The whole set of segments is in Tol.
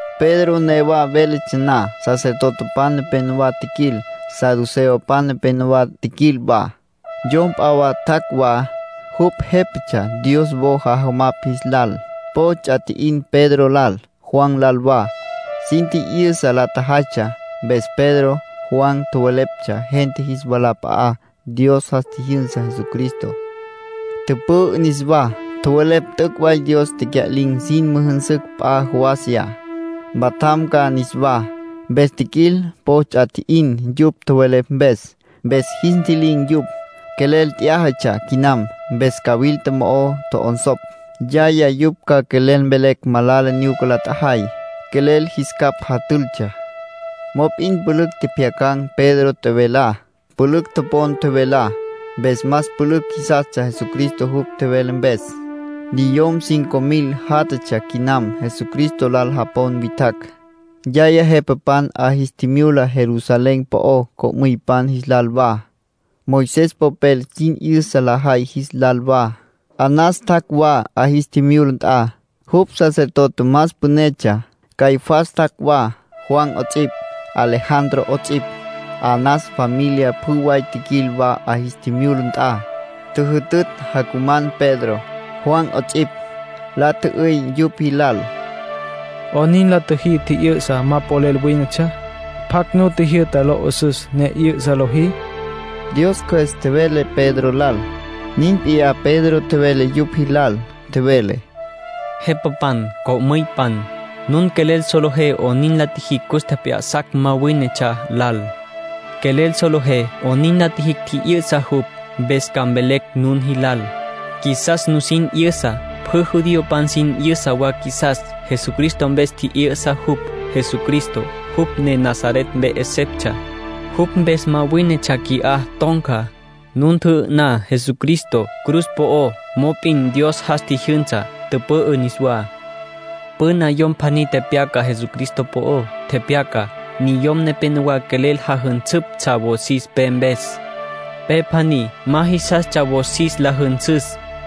Pedro newa véletsja na, sacerdotepan nepenowá tjiquil. Saduceopan nepenowá tjiquil wa. Yom p'a wa tjac' wa, jupj jépatsja Dios wo jajamapj jis lal. Po ts'a tji'in Pedro lal, Juan lal wa, sin tji'yüsa la tjajaytsja mpes. Pedro, Juan, tjoweleptsja gente jis walap'a'á Dios jas tjijyünsa Jesucristo, tüpü'ü niswá. Tjowelepj t'üc' way Dios tecya'lin̈ sin müjünsüs wa p'a jawasiyá, mpatjam ca niswá. Mpes tjiquil po ts'a tji'in yupj tjowelepj mpes. Mpes jis ntji'lin̈ yupj. Quelel t'yájatsja quinam, mpes cawilta mo'o tjo'onsopj. Yaya yupj ca quelel mvelecj malala nyuca la tjajay. Quelel jis capj jatültsja. Mop'in pülücj tjepjyacan̈ Pedro tjevelá. Pülücj topon tjevelá. Mpes más pülücj jisastsja Jesucristo jupj tjevele mpes. Niyom cinco mil játjatsja quinam Jesucristo lal japon witjacj. Yaya jepapan 'a jis tjimyula Jerusalén po'ó co'müypan jis lal wa, Moisés popel sin 'yüsa lajay jis lal wa. Anás tjac' wa 'a jis tjimyula nt'a. Jupj sacerdote más pünetsja. Caifás tjac' wa, Juan 'ots'ipj, Alejandro 'ots'ipj. Anás familia pjü way tjiquil wa 'a jis tjimyula nt'a. Tjüjütütj jacuman Pedro, Juan 'ots'ipj. La tjü'üy yupj jilal: —¿'Onin la tjüjí tji'yü'sa ma polel wínetsja? ¿Pjacj nu tjijyü'ta lo 'üs'üs ne 'yü'sa lojí? —nin la tjü'üy. Dios Cjües tjevele Pedro lal. Nin p'iyá Pedro tjevele yupj jilal. Tjevele: —Jepapan, co'müypan, nun quelel solejé 'onin la tjijicj cus tjep'ya'sacj ma wínetsja lal. Quelel solejé 'onin la tjijicj tji'yü'sa jupj. Mpes ca mvelecj nun jilal. Qjuisas nusin 'yüsa; pjü judiopan sin 'yüsa wa qjuisas. Jesucristo mpes tji'yü'sa jupj. Jesucristo, jupj ne Nazaret mpe 'eseptsja. Jupj mpes ma wínetsja qui'á ton̈ca. Nun tjü'ü'ná Jesucristo cruz po'ó pero Dios jas tjijyünsa, tüpü'ü niswá. Püna yom pjaní tepyaca Jesucristo po'ó. Tepyaca: ‘Niyom nepénowa quelel jajünsüptsja wosis pe mpes. Pe pjaní ma jisastsja wosis la jünsüs.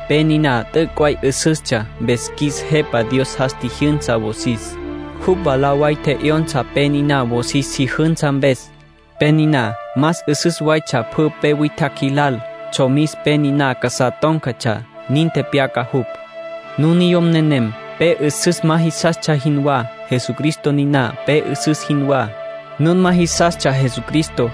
Pe niná t'üc' way 'üsüstsja. Mpes qjuis Jepa Dios jas tjijyünsa wosis. Jupj mwalá way tje'yonsa pe niná wosis si jünsa mpes. Pe niná más 'üsüs waytsja pjü pe witjacj jilal. Tsjomis pe niná casá tón̈catsja.’ Nin tepyaca jupj. Nun niyom nenem pe 'üsüs ma jisastsja jinwá. Jesucristo niná pe 'üsüs jinwá. Nun ma jisastsja Jesucristo.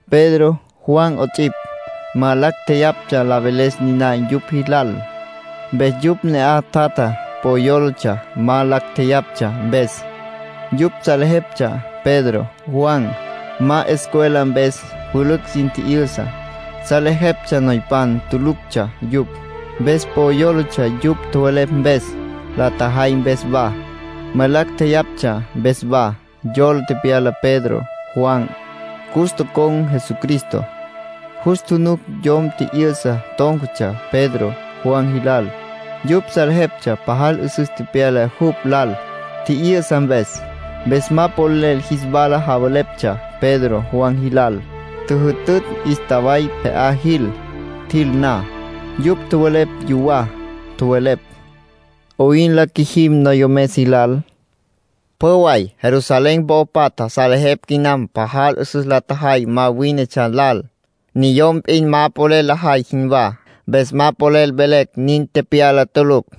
Pedro, Juan 'ots'ipj, ma lacj tjeyaptsja la veles niná yupj jilal. Mpes yupj ne'aj tjatja po yólatsja ma lacj tjeyaptsja mpes. Yupj salejeptsja Pedro, Juan, ma escuela mpes pülücj sin tji'yüsa. Salejeptsja noypan tuluctsja yupj. Mpes po yólatsja yupj tjowelepj mpes, la tjajay mpes wa, ma lacj tjeyaptsja mpes wa. Yola tepyala Pedro, Juan, cus tocon̈ Jesucristo. Jus tjunuc yom tji'yü'sa tón̈catsja Pedro, Juan jilal. Yupj salejeptsja pajal 'üsüs tepyala jupj lal, tji'yü'sa mpes. Mpes ma polel jis wala javeleptsja Pedro, Juan jilal. Tjüjütütj 'ístaway pje'á jil. Tjil na, yupj tjowelepj yuwá. Tjowelepj: “¿'Oyn la qjuijim noyomes jilal? Pjü way Jerusalén po'o patja salejepj quinam pajal 'üsüs la tjajay ma wínetsja lal, niyom p'in ma polel lajay jinwá. Mpes ma polel velecj nin tepyala tulucj.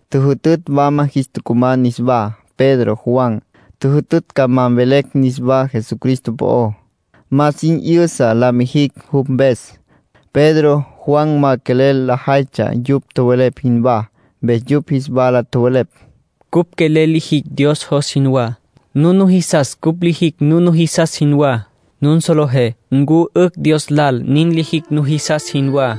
Tjüjütütj wama jis tucuman niswá, Pedro, Juan. Tjüjütütj ca ma mvelecj niswá Jesucristo po'ó, ma sin 'yüsa la mijicj jupj mpes. Pedro, Juan ma quelel lajaytsja yupj tjowelepj jinwá. Mpes yupj jis wala tjowelepj: —Cupj quelel lijicj Dios jos jinwá. Nun nujisas cupj lijicj nun nujisas jinwá. Nun solejé ncu 'ücj Dios lal nin lijicj nujisas jinwá.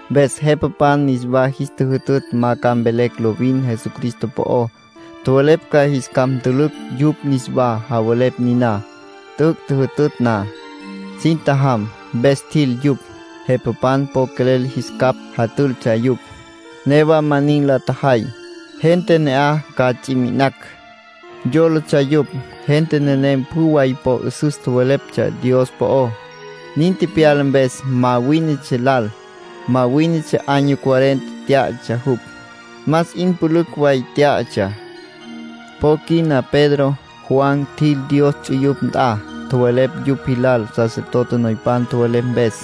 Mpes jepapan niswa jis tjüjütütj ma ca mvelecj lovin Jesucristo po'ó. Tjowelepj ca jis capj ntülücj yupj niswá javelepj niná. T'üc' tjüjütütj na, sin tjajam. Mpes tjil yupj. Jepapan po quelel jis capj jatültsja yupj. Newa ma nin la tjajay. Gente ne'aj ca ts'i mi'inacj, yólatsja yupj. Gente nenem pjü way po 'üsüs tjoweleptsja Dios po'ó, nin tepyala mpes ma wínetsja lal. Ma wínetsja año cuarenta tyá'atsja jupj, más 'in pülücj way tyá'atsja. Po quina Pedro, Juan, tjil Dios ts'uyupj nt'a. Tjowelepj yupj jilal sacerdote noypan tjowelepj mpes,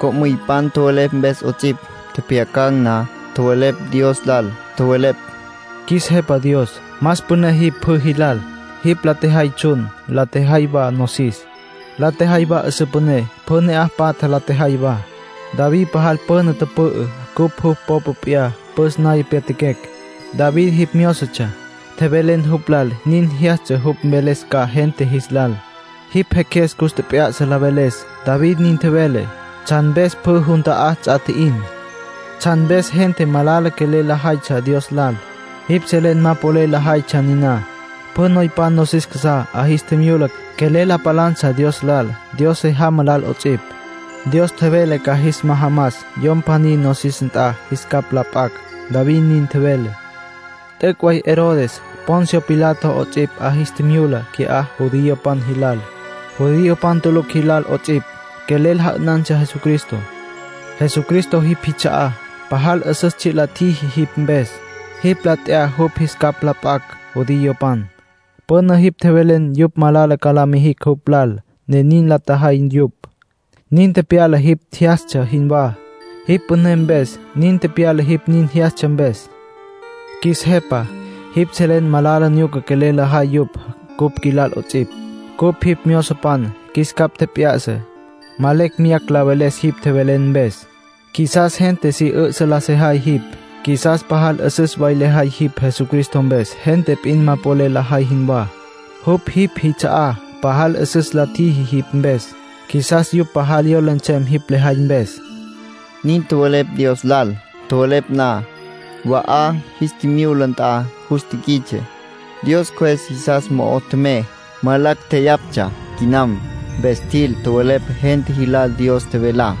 co'müypan tjowelepj mpes 'ots'ipj. Tjepjyacan̈ na, tjowelepj Dios lal. Tjowelepj: “Qjuis Jepa Dios, más püné jipj pjü jilal. ‘Jipj la tjejay tsjun, la tjejay wa nosis, la tjejay wa 'üsǘ püné. Pjü ne'aj patja la tjejay wa.’ David pajal püna tüpü'ü, cupj jupj popa p'iyá püs naya pyatjaquecj. David jipj myózotsja. Tjevelen jupj lal nin jyastsja jupj mveles ca gente jis lal. Jipj Jeqjues cus tjep'ya'sa la veles. David nin tjevele: ‘¿Tsjan mpes pjü jun ta'á ts'a tji'in? ¿Tsjan mpes gente malala quelel lajaytsja Dios lal? Jipj selen ma polel lajaytsja niná. Pjü noypan nosis casá 'a jis tjimyula, quelel la palantsja Dios lal, Dios se jamá lal 'ots'ipj. Dios tjevele ca jas majamas yom pjaní nosis nt'a jis capj la p'acj’, David nin tjevele. T'üc' way Herodes, Poncio Pilato 'ots'ipj, 'a jis tjimyula qui'á judiopan jilal, judiopan tulucj jilal 'ots'ipj. Quelel ja'ünantsja Jesucristo. Jesucristo jipj jits'a'á, pajal 'üsüs tsji' la tjiji jipj mpes. Jipj la t'ya jupj jis capj la p'acj judiopan. Püna jipj tjevelen yupj malala ca la mijicj jupj lal, ne nin la tjajay yupj. Nin tepyala jipj jyastsja jinwá, jipj püné mpes. Nin tepyala jipj nin jyastsja mpes. Qjuis Jepa, jipj selen malala nyuca quelel lajay yupj cupj qjuilal 'ots'ipj. Cupj jipj myozopan. Qjuis capj tjep'ya'sa, ma lecj meyacj la veles jipj tjevelen mpes. Qjuisas gente si 'ü'sa la sejay jipj. Qjuisas pajal 'üsüs way lejay jipj Jesucristo mpes, gente p'in ma polel lajay jinwá. Jupj jipj jits'a'á, pajal 'üsüs la tjiji jipj mpes. Qjuisas yupj pajal yola nsem jipj lejay mpes”, nin tjowelepj Dios lal. Tjowelepj na, wa 'a jis tjimyula nt'a jus tiquits'e. Dios Cjües jisas mo'o tjemey. Ma lacj jeyaptsja quinam, mpes tjil, tjowelepj gente jilal Dios tjevelá.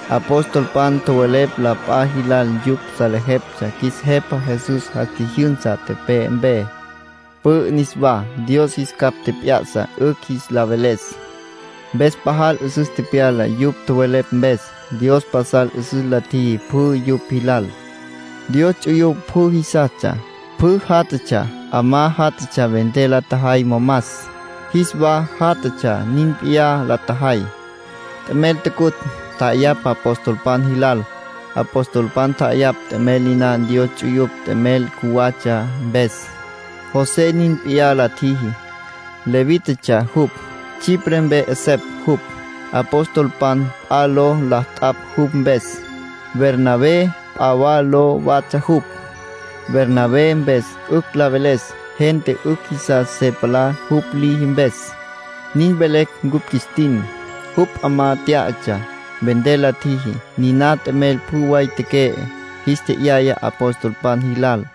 Apostolpan tjowelepj la p'a jilal yupj salejeptsja qjuis Jepa Jesús jas tjijyünsa tepe'e mpe, pü'ü niswá. Dios jis capj tjep'ya'sa 'ücj jis la veles, mpes pajal 'üsüs tepyala yupj tjowelepj mpes. Dios pasal 'üsüs la tjiji pjü yupj jilal. Dios ts'uyupj pjü jisastsja, pjü jatatsja. 'Amá jatatsja vender la tjajay momas. Jis wa jatatsja nin p'iyá la tjajay. T'emel tucutj, tja'ayapj apostolpan jilal. Apostolpan tja'ayapj t'emel niná Dios ts'uyupj t'emel cjuwatsja mpes. José nin p'iyá la tjiji. Levítatsja jupj. Chipre mpe 'esepj jupj. Apostolpan p'a ló la t'apj jupj mpes. Bernabé p'a wa ló watsja jupj. Bernabé mpes 'ücj la veles “gente 'ücj jisas se palá jupj liji mpes”, nin velecj cupj qjuis tin. Jupj 'amá tyá'atsja. Vender la tjiji. Niná t'emel pjü way teque'e, jis tje'yaya apostolpan jilal.